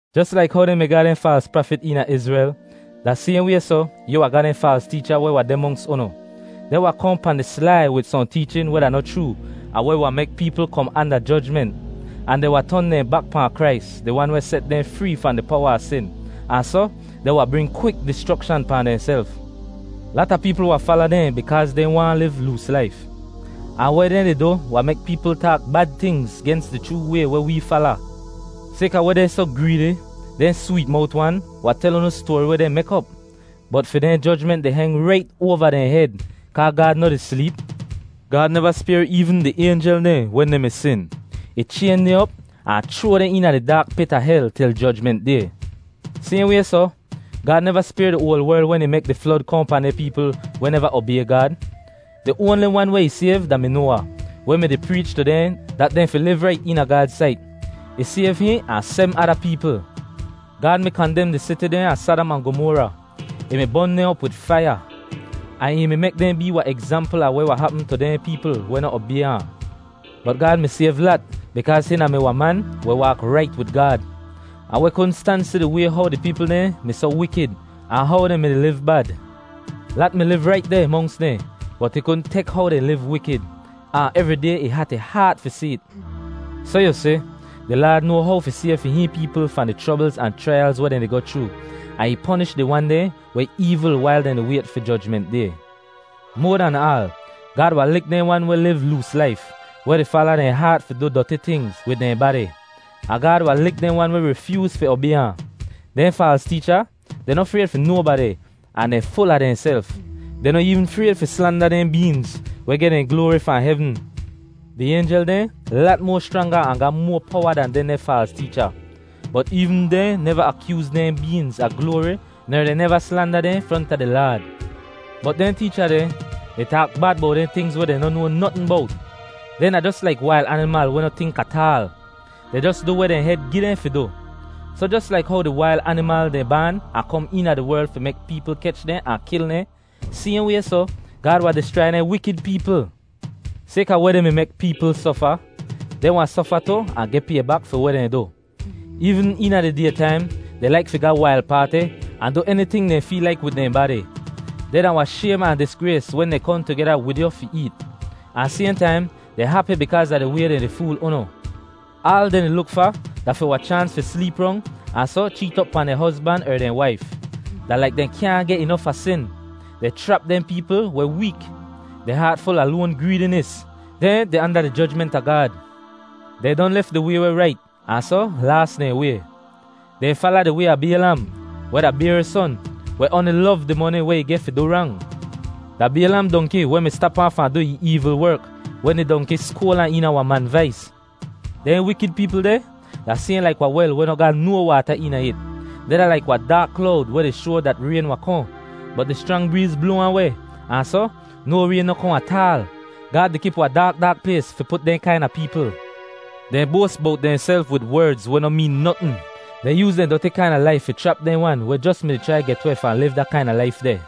Jos laik how dehn mi ga dehn faals prafit eena Izrel, da sayhn way soh, yu wahn ga dehn faals teecha weh wahn deh monks unu. Dehn wahn kohn pahn di slai wid sohn teechin weh da noh chroo ahn weh wahn mek peepl kom anda jojment; ahn dehn wahn ton dehn bak pahn Krais, di Wan weh set dehn free fahn di powa a sin, ahn soh dehn wahn bring kwik dischrokshan pahn dehnself. Lata peepl wahn fala dehn bikaaz dehn waahn liv loos laif. Ahn weh dehn di du wahn mek peepl taak bad tingz gens di chroo way weh wee fala. Sayka weh dehn soh greedi, dehn sweet mowt wan wahn tel unu stoari weh dehn mek op. Bot fi dehn jojment di heng rait oava dehn hed kaa Gaad noh di sleep. Gaad neva spayr eevn di aynjel dehn wen dehn mi sin. Ih chayn dehn op ahn chroa dehn eena di daak pit a hel til Jojment Day. Sayhn way soh, Gaad neva spayr di oal werl wen ih mek di flod kohn pahn dehn peepl weh neva obay Gaad. Di oanli wan weh ih sayv da-mi Noawa, weh mi-di preech tu dehn dat dehn fi liv rait eena Gaad sait. Ih sayv hihn ahn sebm ada peepl. Gaad mi kandem di siti dehn a Sadam ahn Gomora; ih mi bon dehn op wid faiya, ahn ih mi mek dehn bee wahn egzampl a weh wahn hapm tu dehn peepl weh noh obay ahn. Bot Gaad mi sayv Lat bikaaz hihn da-mi wahn man weh waak rait wid Gaad, ahn weh kudn stan si di way how di peepl dehn mi soh wikid ahn how dehn mi-di liv bad. Lat mi liv rait deh monks dehn bot ih kudn tek how dehn liv wikid, ahn evri day ih hat ih haat fi si it. Soh yu si, di Laad noa how fi sayv fi hihn peepl fahn di chroblz ahn chraiyalz weh dehn di goh chroo, ahn ih ponish di wan dehn weh eevl wail dehn di wayt fi Jojment Day. Moa dan aal, Gaad wahn lik dehn wan weh liv loos laif, weh di fala dehn haat fi du doti tingz wid dehn badi; ahn Gaad wahn lik dehn wan weh rifyooz fi obay ahn. Dehn faals teecha, dehn noh frayd fi nobadi ahn dehn ful a dehnself. Dehn noh eevn frayd fi slanda dehn beengz weh geh dehn gloari fahn hevn. Di aynjel dehn lat moa schranga ahn ga moa powa dan dehndeh faals teecha, bot eevn dehn neva akyooz dehn beengz a gloari ner dehn neva slanda dehn fronta di Laad. Bot dehn teecha deh, dehn taak bad bowt dehn tingz weh dehn noh noa notn bowt. Dehn da jos laik wail animal weh noh tink ataal. Dehn jos du weh dehn hed gi dehn fi du. Soh jos laik how di wail animal dehn baan ahn kom eena di werl fi mek peepl kech dehn ahn kil dehn, sayhn way soh, Gaad wahn dischrai dehn wikid peepl. Sayka weh dehn mi mek peepl sofa, dehn wahn sofa tu ahn geh pay bak fi weh dehn du. Eevn eena di day taim, dehn laik fi ga wail paati, ahn du eniting dehn feel laik wid dehn badi. Dehn da wahn shaym ahn disgrays wen dehn kohn tugeda wid yu fi eet, ahn sayhn taim, dehn hapi bikaaz a di way dehn di fool unu. Aal dehn di luk fa da fi wahn chaans fi sleep rong ahn soh cheet op pahn dehn hozban er dehn waif. Da laik dehn kyaahn geh inof a sin. Dehn chrap dehn peepl weh week. Dehn haat ful a loan greedinis. Dehn deh anda di jojment a Gaad. Dehn don lef di way weh rait ahn soh laas dehn way. Dehn fala di way a Baylam, weh da Bayor son, weh oanli lov di moni weh ih geh fi du rang. Da Baylam dongki weh mi stap ahn fahn du ih eevl werk wen di dongki skoal ahn eena wahn man vais. Dehn wikid peepl deh da sayhn laik wahn wel weh noh ga no waata eena it. Dehn da laik wahn daak klowd weh di shoa dat rayn wahn kohn, bot di schrang breez bloa ahn weh, ahn soh no rayn noh kohn ataal. Gaad di kip wahn daak daak plays fi put dehn kaina peepl. Dehn boas bowt dehnself wid werdz weh no meen notn. Dehn yooz dehn doti kaina laif fi chrap dehn wan weh jos mi-di chrai get weh fahn liv da kaina laif deh.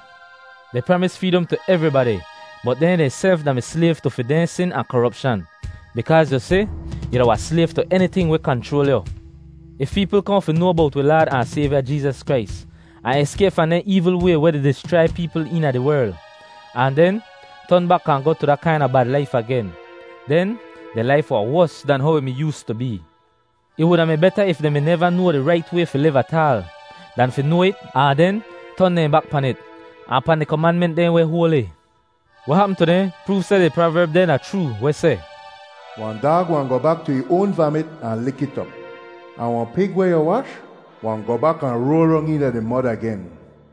Dehn pramis freedom tu evribadi bot dehn dehnself da-mi slayv tu fi dehn sin ahn koropshan; bikaaz yu si, yu da wahn slayv tu eniting weh kanchroal yu. If peepl kohn fi noa bowt wi Laad ahn Sayvya Jeezas Krais, ahn eskayp fahn dehn eevl way weh di dischrai peepl eena di werl, ahn den ton bak ahn goh tu da kaina bad laif agen, den dehn laif wahn wos dan how ih mi yoostu bee. Ih wuda mi beta if dehn mi neva noa di rait way fi liv ataal, dan fi noa it ahn den ton dehn bak pan it, ahn pahn di komanment dehn weh hoali. Weh hapm tu dehn proov seh di praverb dehn da chroo weh seh, “Wahn daag wahn goh bak tu ih oan vamit ahn lik it op.” Ahn, “Wahn pig weh yu wash wahn goh bak ahn roal rong eena di mod agen.”